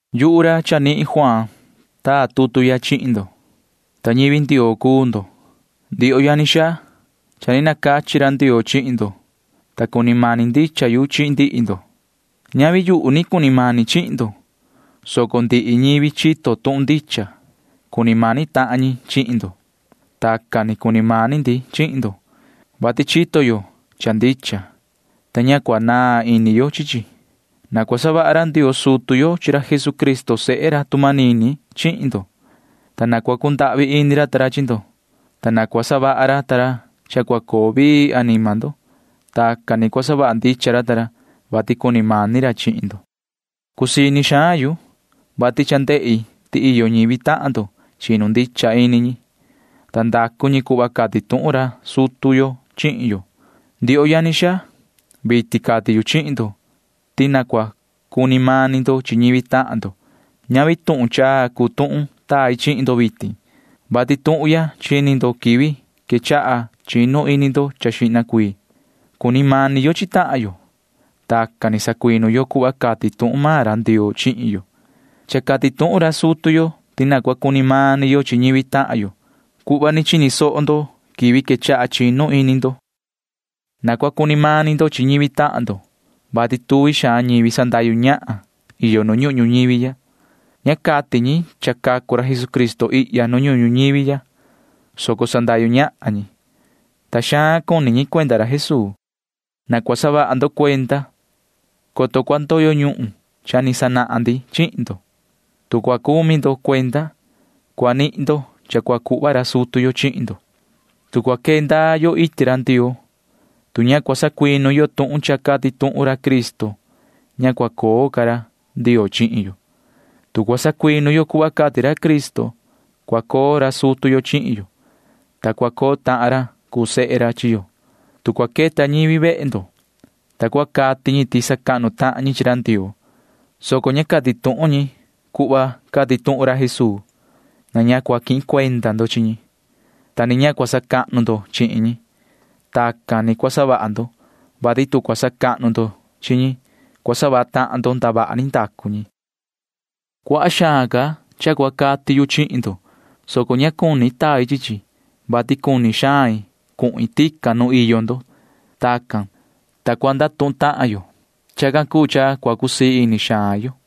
Yuhu ra Juaan ra chanihin taa tutu ya chihin ndo, ta ñivi Ndioo cuu ndo, ndioho yani xaa. Cha ni nacachi ra Ndioo chihin ndo, ta cuni mani ndicha yu chi ndihi ndo. Ñavi yuhu ni cuni mani chihin ndo, soco ndihi ñivi chito tuhun ndicha―cuni mani tahan ñi chihin ndo. Tacan ni cuni mani ndi chihin ndo, vati chito yo cha ndicha, ta ña cua naan ini yo chi chi. Na cua savaha ra Ndioo sutu yo chi ra Jesucristo sehe ra tu manini chihin ndo, ta na cua cundahvi ini ra ta ra chihin ndo, ta na cua savaha ra ta ra cha cua coo vii anima ndo. Tacan ni cua savaha ndicha ra ta ra, vati cuni mani ra chihin ndo. Cusii ini xaan yu, vati cha ndehi ti iyo ñivi tahan ndo chinu ini cha ndicha, ta ndacu ñi cuhva cati tuhun ra sutu yo chihin yo. Ndioho yani xaa, vitin cati yu chihin ndo ti na cua cuni mani ndo chi ñivi tahan ndo. Ñavi tuhun chaa cuu tuhun tai chihin ndo vitin, vati tuhun ya chini ndo quivi quechaha chinu ini ndo xihna cuii. Cuni mani yo chi tahan yo. Tacan ni sacuinu yo cuhva cati tuhun maan ra Ndioo chihin yo. Cha cati tuhun ra sutu yo ti na cua cuni mani yo chihin ñivi tahan yo cuhva ni chini soho ndo quivi quechaha chinu ini ndo. Na cua cuni mani ndo chi ñivi tahan ndo, vati cha iyo tuvi xaan ñivi sandahyu ñahan ihya nu ñuhun ñuñivi ya. Ña cati ñi ti cacu tahan ra Jesucristo ihya nu ñuhun ñuñivi ya, soco sandahyu ñahan ñi, ta cuni xaan ñi cuati chi ra Jesuu. Na cua saha vaha ndo cuenda, coto cua ndoyo ñuhun cha ni savaha ndi chihin ndo. Tu cua saha vaha ndo cuenda, cua nihin vaha ndo cha cua cuhva ra sutu yo chihin ndo. Tu cua quee ndaa yo iti ra Ndioo, tu ña cua sacuinu yo tuhun cha cati tuhun ra Cristo, ña cua coo ca ra Ndioo chihin yo. Tu cua sacuinu yo cuhva cati ra Cristo, cua coo ra sutu yo chihin yo, ta cua coo tahan ra cuu sehe ra chihin yo. Tu cua queta ñivi vehe ndo, ta cua cati ñi ti sacahnu tahan ñi chi ra Ndioo, soco ña cati tuhun ñi cuhva cati tuhun ra Jesuu, na ña cua quihin cuenda ndo chi ñi, ta ni na ña cua sacahnu ndo chihin ñi. Tacan ni cua savaha ndo, vati tu cua sacahnu ndo chihin ñi, cua savaha tahan ndo ndavaha ni ndacu maan ñi. Cuaha xaan ca cha cua cati yu chihin ndo, soco ña cuni tai chi chi, vati cuni xain cuhin tican nu iyo ndo. Tacan cuu, ta cua ndatuhun tahan yo. Chacan cuu cha cua cusii ini xaan yo.